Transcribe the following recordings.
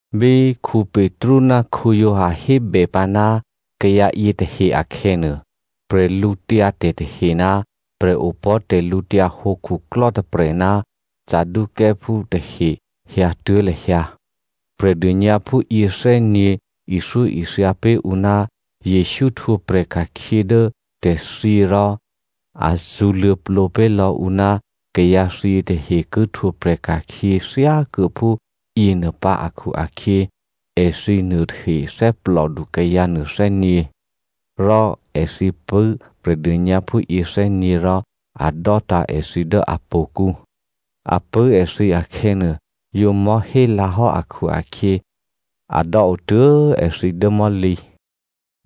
Bí Petru ná Giovanni hébèpǎ ná kayǎ yětahe akhè̌nuô, bwídu tahe ná prè̤opò̤́ tè̤lǔhǒdu khuklò́ tôprè̤ ná Saducěophú tahe hyǎtuố̤ lahyǎ. Prè̤dônyǎphú yěthè́nyě̤ ithyóithya pé̤ ǔ ná Jesǔ htwǒprè̤ ka̤khyě dố tè̤thyě rò a zṳ̌luô̌plǒ pé̤ lò̌ ǔ ná kayǎthyě tahe ki htwǒprè̤ ka̤khyě thyákuô̌phú yěnuô pǎ akhu-akhyě, èthǐ nuôtahe thè́plòdu kayǎ nuôthè́nyě̤. Rò èthǐ pṳ̂́ Prè̤dônyǎphú yěthè́nyě̤ rò a dò́tǎ̤ èthǐ dố htò̌kǔ. A pṳ̂́ èthǐ akhè̌nuô, yǒ mò̤́hélǎhò́ akhu-akhyě a dò́o tuố̤ èthǐ dố mò̤́lǐ.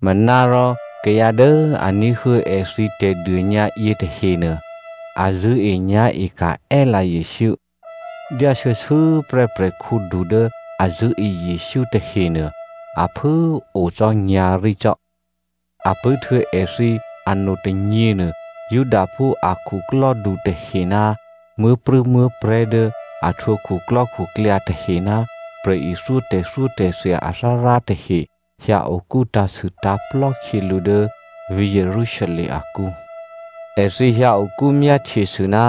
Manárò kayǎ dố a ní̤huô̌ èthǐ tè̤dônyǎ yětahenuô, a zṳ̂́enyá̤eka̤ è́lǎ Jesǔ. Dyá shuô̌shuô̌ prè́ prè̤khǔdu dố a zṳ̂́e Jesǔ tahenuô a phû꤮ o cò́ nyǎ̤rí cò́. A pṳ̂́htuô̌ èthǐ anotônyěnuô Judaphú a khuklò́du tahe ná muố̤prû̌muố̤prè̤́ dố a htwǒ khuklò́khuklyǎ tahe ná prè̤ithyó tè̤thyótè̤thya athárá tahe hyǎ okú tǎ̤sûtǎ̤plò́ khyělǔ dố vǐ̤ Jerusalem akǔ. Èthǐ hyǎ okú myáhtyesû ná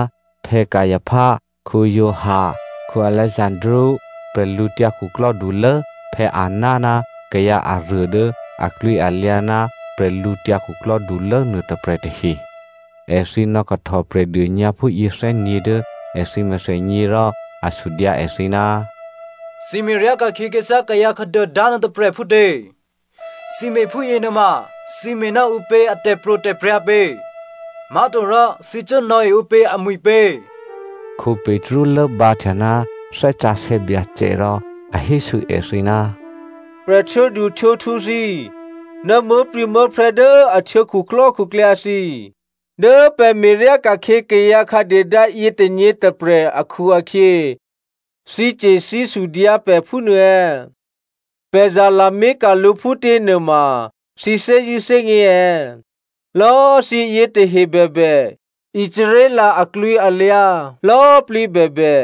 Caipha, Giovanni, Alexandro, bwídukhulố Anna ná kayǎ aruô dố aklwǐalyǎ ná bwídukhulố nuôtôprè̤ tahe. Èthǐ nò̌kahtò Prè̤dônyǎphú yěthè́nyě̤ dố èthǐ mèthènyě rò a sudyǎ èthǐ, “Thǐ me̤ryá ka̤khyě khyěthyá kayǎ khǎduôdá nuôtôprè̤ phútě? Thǐ me̤phúyě nuôma thǐ me̤ ná ǔpě a tè̤pro̤tè̤prya̤ pě? Má̤torò thǐ cuố nò̌e ǔpě amwi̤ pě?” Petru lốbǎhtya ná Thè́ Sǎsè̌ Byacè rò a hésû èthǐ, “Prè̤htwǒduhtwǒkhu thǐ꤮ ná muố̤prû̌muố̤prè̤́ dố a htwǒ khuklò́khuklyǎ thǐ꤮ dố pè̤ me̤ryá ka̤khyě kayǎ khǎduôdá yětônyě tôprè̤ akhu-akhyě thǐce̤ thǐsudyǎ pè̤ phúnuô è̌? Pè̤ zalamé̤ka̤ lǔ phútě nuôma thǐ thè́zṳ̂́ thè́gně è̌? Lò̌꤮ thǐ yětahe bèbè, Israel aklwǐalyǎ lò̌꤮ plǐ bèbè,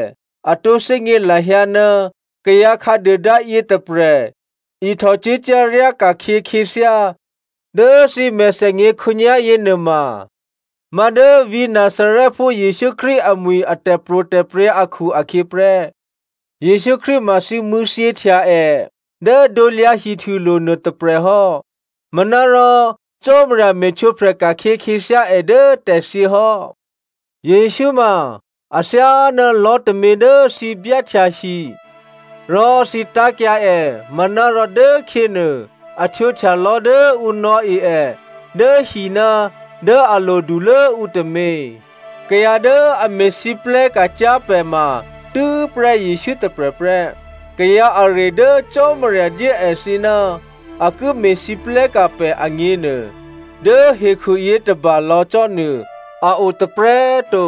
a tǒ thè́gně lahyǎ ná kayǎ khǎduôdá yětôprè̤ ihtòcuốcyá̤ ryáka̤khyě khyěthyá dố thǐ mèthènyě khǒnyá̤yě nuôma má̤dố vǐ̤ Nazarèphú Jesǔ Krístu amwi̤ a tè̤pro̤tè̤prya̤ akhu-akhyě prè́. Jesǔ Krístu ma thǐ mṳ̂̌thyěhtya è dố krusulo̤ nuôtôprè̤ hò́, manárò Cò́marya me̤htwǒprè̤ ka̤khyě khyěthyá è dố tè̤thyě hò́. Jesǔ ma, ‘A thyáná lò̤́ tômě dố thǐ byáhtya hi rò thǐ tá̤kyǎ è manárò dốkhyěnuô a htwǒhtya lò̤́ dố ǔ nò̌e è dố hiná̤ dố a lodulố ǔ tômě.’ “Kayǎ dố a me̤lwóhteka̤ cyá̤ pè̤ ma tû́prè́ Jesǔ tôprè̤ prè́. Kayǎ aruô dố Cò́marya dyé èthǐ ná a ki me̤lwóhteka̤ pè̤ agněnuô, dố hekhu yětôba lò̌ cò́ nuô a o tôprè̤꤮ to.”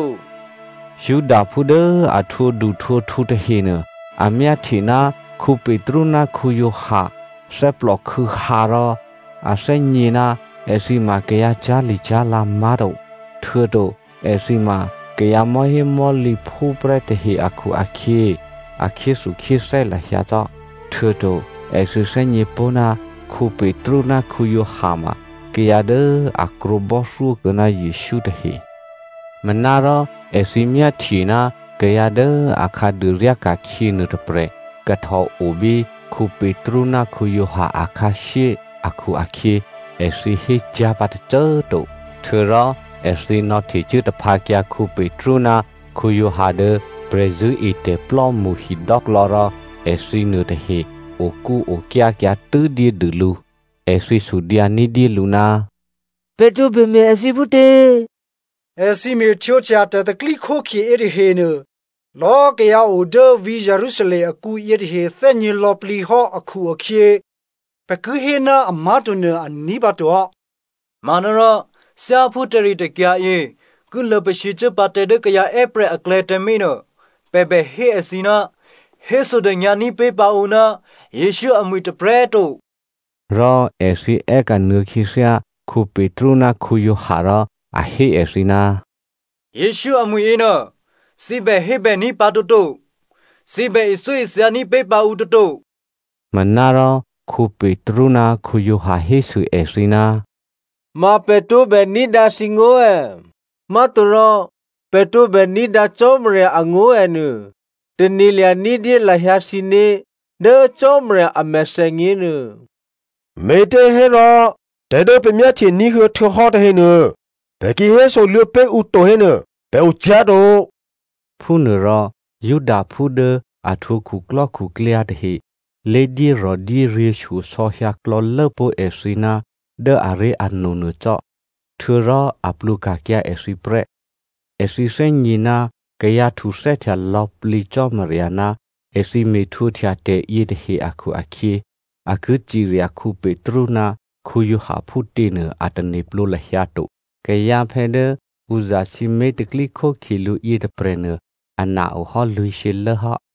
Judaphú dố a htwǒduhtwǒkhu tahenuô, a myáhtye ná Petru ná Giovanni thè́plòkhû̌hǎ rò a thè́gně ná èthǐ ma kayǎ cyá̤licyá̤lè má̤to htuô̌to èthǐ ma kayǎ mò̤́hémò̤́lǐphú prè́ tahe akhu-akhyě, a khyéthukhyéthè́ lahyǎ cò́. Htuô̌to èthǐ thè́gně pó̤ ná Petru ná Giovanni ma kayǎ dố a krwǒbò́thyó kuô̌ ná Jesǔ tahe. Manárò èthǐ myáhtye ná kayǎ dố akhǎduô ryáka̤khyě nuôtôprè̤ kahtò o bí Petru ná Giovanni akhǎshyé akhu-akhyě èthǐ hécyá̤ pǎ tôcô꤮ to. Htuô̌rò èthǐ nò̌htecuố tǎphǎkyǎ Petru ná Giovanni dố prè̤zṳ̂́etè̤plò́mṳ hidò́klò̌ rò èthǐ nuôtahe okúokyákyǎ tû́ dyédû lǔ. Èthǐ sudyǎ ní̤dyélǔ, “Pè̤ tǒbè me̤ èthǐ phútě? Èthǐ me̤htwǒhtya tè̤pro̤tè̤prya̤ yětahenuô lò̌꤮ kayǎ o dố vǐ̤ Jerusalem akǔ yětahe thè́gně lò̌plǐ hò́ akhu-akhyě pè̤ ki hé ná amá̤to nuô a ní̤pǎto hò́. Manárò, thyáphú tè̤ritè̤kyǎ yě ki luô̌pasǐcuố pǎ tǎ dố kayǎ è́prè̤ aklè̌ tǎmé̤ nuô, pè̤ bè hé èthǐ ná bè hésodônyǎní̤ pé̤ pǎ ǔ ná Jesǔ amwi̤ tôprè̤꤮ to.” Rò èthǐ è́kanuô̌ khyěthyá Petru ná Giovanni rò a hé èthǐ, “Jesǔ amwi̤ yěnuô, thǐ bè hébèní̤ pǎ toto, thǐ bè ithyóithyaní̤ pé̤ pǎ ǔ toto.” Manárò Petru ná Giovanni hésû èthǐ, “Ma pè̤ tǒbè ní̤dǎ thǐngó̤ è̌? Má̤torò pè̤ tǒbè ní̤dǎ Cò́marya angó̤ è̌ nuô, tane̤lya̤ ní̤dyé lahyǎ thǐné̤ dố Cò́marya a mèthènyě nuô. Me̤těhérò tè̤ dố pè̤ myáhtye ní̤huô̌ htuô̌hò́ tahenuô pè̤ ki hésoluô̌ pé̤ ǔ to hénuô, pè̤ ocyá̤ to.” Phúnuôrò Judaphú dố a htwǒ khuklò́khuklyǎ tahe lé dyérò̤dyéryě̤ shyosò̌ hyǎklò̌lố pó̤ èthǐ ná dố aré̤ano nuô cò́, htuô̌rò a plwǒka̤kyǎ èthǐ prè́. Èthǐ thè́gně ná kayǎ htuthè́htya lò̌plǐ Cò́marya ná èthǐ me̤htwǒhtya tè̤yětahe akhu-akhyě a ki cirya Petru ná Giovanni phútěnuô a tane̤plǒ lahyǎ to. Kayǎphè̌ dố ǔ zasǐmé̤ tè̤pro̤tè̤prya̤ lǔ yětôprè̤nuô ana ohò́ lwǐ̤shyělố hò́.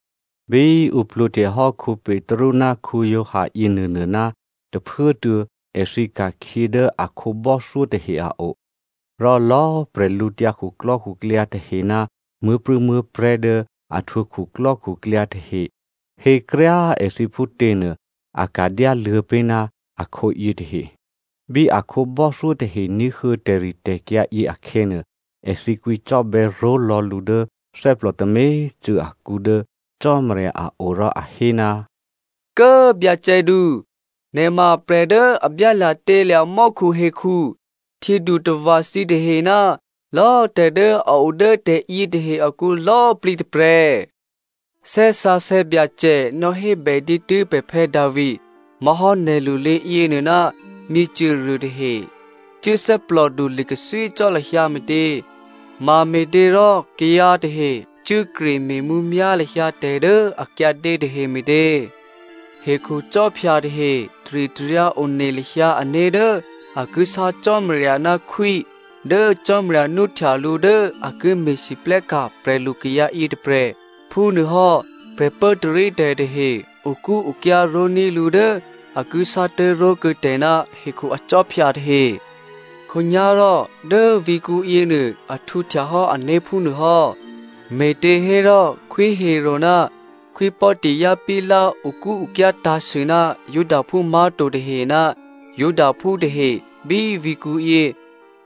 Bí ǔ plwǒhtehò́ Petru ná Giovanni yěnuônuôná tôphuốtuô̌ èthǐ ka̤khyě dố a khǒbò́thyó tahe a o. Rò lò̌꤮ bwídukhu tahe ná muố̤prû̌muố̤prè̤́ dố a htwǒ khuklò́khuklyǎ tahe hékryá꤮ èthǐ phútě nuô, a ka̤dyáluô̌ pé̤ ná akhǒ yětahe. Bí a khǒbò́thyó tahe ní̤huô̌ tè̤ritè̤kyǎ yě akhè̌nuô, èthǐ kwǐcò́bè̌ ró̤lò̌ lǔ dố thè́plò tômě꤮ cû̌ akǔ dố Cò́marya a o rò a hé, “Kố꤮ byacèdu, nè̤ ma prè̤ dố a byálya̤tělya̤ mò́khuhekhu, htyědutava̤ thǐtahe ná lò̌꤮ tè̤ dố a o dố tè̤yětahe akǔ lò̌꤮ plǐ tôprè̤! Thè́ Sǎsè̌ Byacè nò̌hébè dǐtû́ pè̤ Phuô̌ Davi, má̤hò́ nè̤lulé yěnuô, ‘Myěcôruô tahe cuố thè́plòdu li̤kathwí cò́ lahyǎ me̤tě? Mame̤těrò kayǎ tahe cuốkre me̤mǔmyá̤ lahyǎ tè̤ dố a kyǎdě tahe me̤tě? Hekhucò́phya tahe taritaryǎ one lahyǎ ané̤ dố a ki sá Cò́marya ná khwí dố Cò́marya nwóhtya lǔ dố a ki me̤lwóhteka̤ prè̤lu kayǎ yětôprè̤. Phúnuôhò́ prè̤pốtarítè̤ tahe okúokyá ró̤ní̤ lǔ dố a ki sátố̤ró̤kuô̌ tè̤ ná hekhu akhwí tahe.’ “Khǒnyá̤rò dố vǐ̤kǔ yěnuô a htwǒhtyahò́ ané̤ phúnuô hò́! Me̤těhérò Khwí Herodè ná Khwí Pòntio Pilato okúokyá tǎ̤sû ná Judaphú má̤to tahe ná Judaphú tahe bí vǐ̤kǔyě.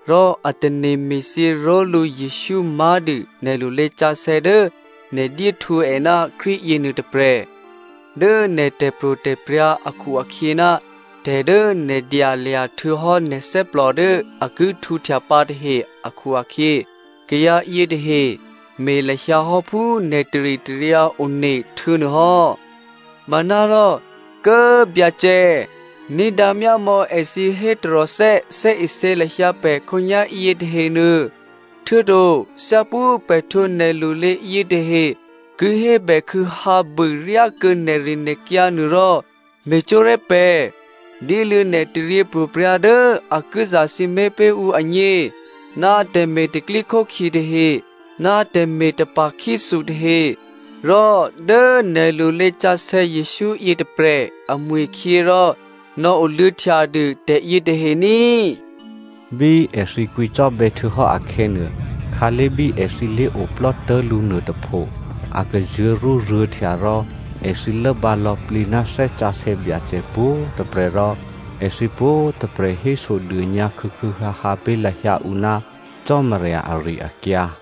Rò a tane̤ me̤thyě ró̤lǔ Jesǔ má̤dû nè̤ lulésǎsè̌ dố nè̤ dyéhtwǒ è ná Krístu yěnuô tôprè̤. Dố nè̤ tè̤pro̤tè̤prya̤ akhu-akhyě ná tè̤ dố nè̤ dyalya̤ htuô̌hò́ nè̤ thè́plò dố a ki htwǒhtya pǎ tahe akhu-akhyě, kayǎ yětahe me̤ lahyǎ hò́ phú nè̤ taritaryǎ one htuô̌nuô hò́. Manárò, Kố꤮ Byacè꤮, ní̤dǎ myámò̌ èthǐ hé taròthè́ thè́isě lahyǎ pè̤ khǒnyá̤yě tahenuô, htuô̌to thyáphú pè̤ htwǒ nè̤lulé yětahe ki hébèkhû̌hǎbû ryákuô̌ nè̤rinè̤kyǎ nuôrò, me̤cwó̤ré̤ pè̤. Dyéluô̌ nè̤ taryěpro̤prya̤ dố a ki zasǐmé̤ ǔ agně, ná tè̤me̤ tè̤pro̤tè̤prya̤ tahe ná tè̤me̤ tapa̤khyéthu tahe, rò dố nè̤ lulésǎsè̌ Jesǔ yětôprè̤ amwi̤khyě rò nò̌oluô̌htya dû tè̤yětahe ní꤮.” Bí èthǐ kwǐcò́bè̌ htuô̌hò́ akhè̌nuô, khǎlé̤ bí èthǐ lé̤oplò́ tố̤lǔ nuôtôpho a kazuô̤̌rúruô̤̌htya rò èthǐ lốbǎ lò̌plǐ ná Thè́ Sǎsè̌ Byacè pwǒ̤꤮ tôprè̤ rò èthǐ pwǒ̤꤮ tôprè̤ hésodônyǎ khû̌khû̌hǎhǎ pé̤ lahyǎ ǔ ná Cò́marya ari-akyǎ.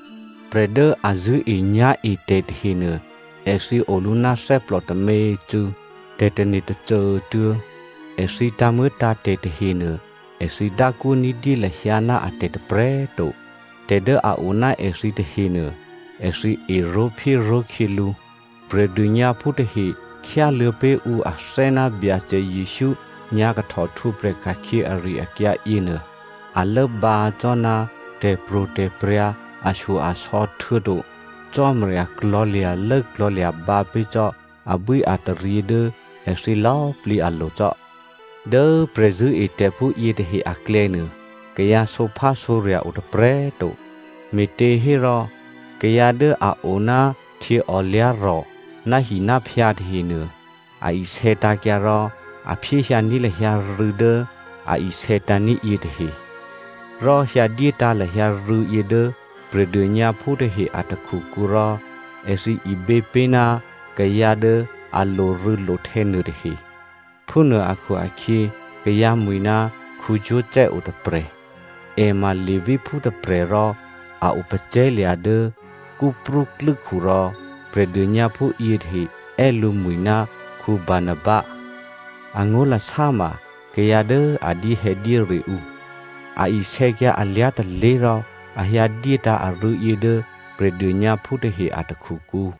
Prè̤ dố a zṳ̂́enyá̤etè̤ tahenuô èthǐ olǔ ná thè́plò tômě꤮ cû̌, tè̤tane̤ tôcô꤮ tuô̌. Èthǐ tǎ̤muô̌tǎ̤tè̤ tahenuô èthǐ dákwó ní̤dyé lahyǎ ná atè̤ tôprè̤꤮ to. Tè̤ dố a o ná èthǐ tahenuô èthǐ eró̤phyéró̤ khyělǔ. Prè̤dônyǎphú tahe khyáluô̌ pé̤ ǔ athè́ ná Byacè Jesǔ nyǎ̤kahtò htwǒprè̤ ka̤khyě ari-akyǎ yěnuô, a lốbǎ cò́ ná tè̤pro̤tè̤prya̤ ashyo-asò̌ htuô̌to Cò́marya klò̤̌lya̤lố klò̤̌lya̤bǎ pé̤ cò́ abwíataryě dố èthǐ lò̌꤮ plǐ alo̤ cò́. Dố prè̤zṳ̂́etè̤phú yětahe aklè̌nuô, kayǎ sǒphásǒrya̤ o tôprè̤꤮ to, me̤těhérò kayǎ dố a o ná htyěòlyá̤rò̤, náhináphyǎ tahenuô, a isè̌tǎ̤kyǎ rò a phyéhyǎní̤ lahyǎ rû̌ dố a isè̌tǎ̤ní̤ yětahe, rò hyǎdyétǎ̤ lahyǎ rû̌yě dố Prè̤dônyǎphú tahe a takhukǔ rò èthǐ ibě pé̤ ná kayǎ dố a lorû̌lohtè̌ nuôtahe. Phúnuô akhu-akhyě kayǎ mwi̤ ná Joseph o tôprè̤, è ma Leviphú tôprè̤ rò a o pacè̤̌lya̤ dố Cyprú klû́khu, rò Prè̤dônyǎphú yětahe è́ lǔmwi̤ ná Barnaba (Angó̤lasá ma kayǎ dố a dyéhè̌dyére ǔ) a isè̌kyǎ alyá̤ tôlé̤ rò a hyǎ dyétǎ̤ arû̌yě dố Prè̤dônyǎphú tahe a takhukǔ.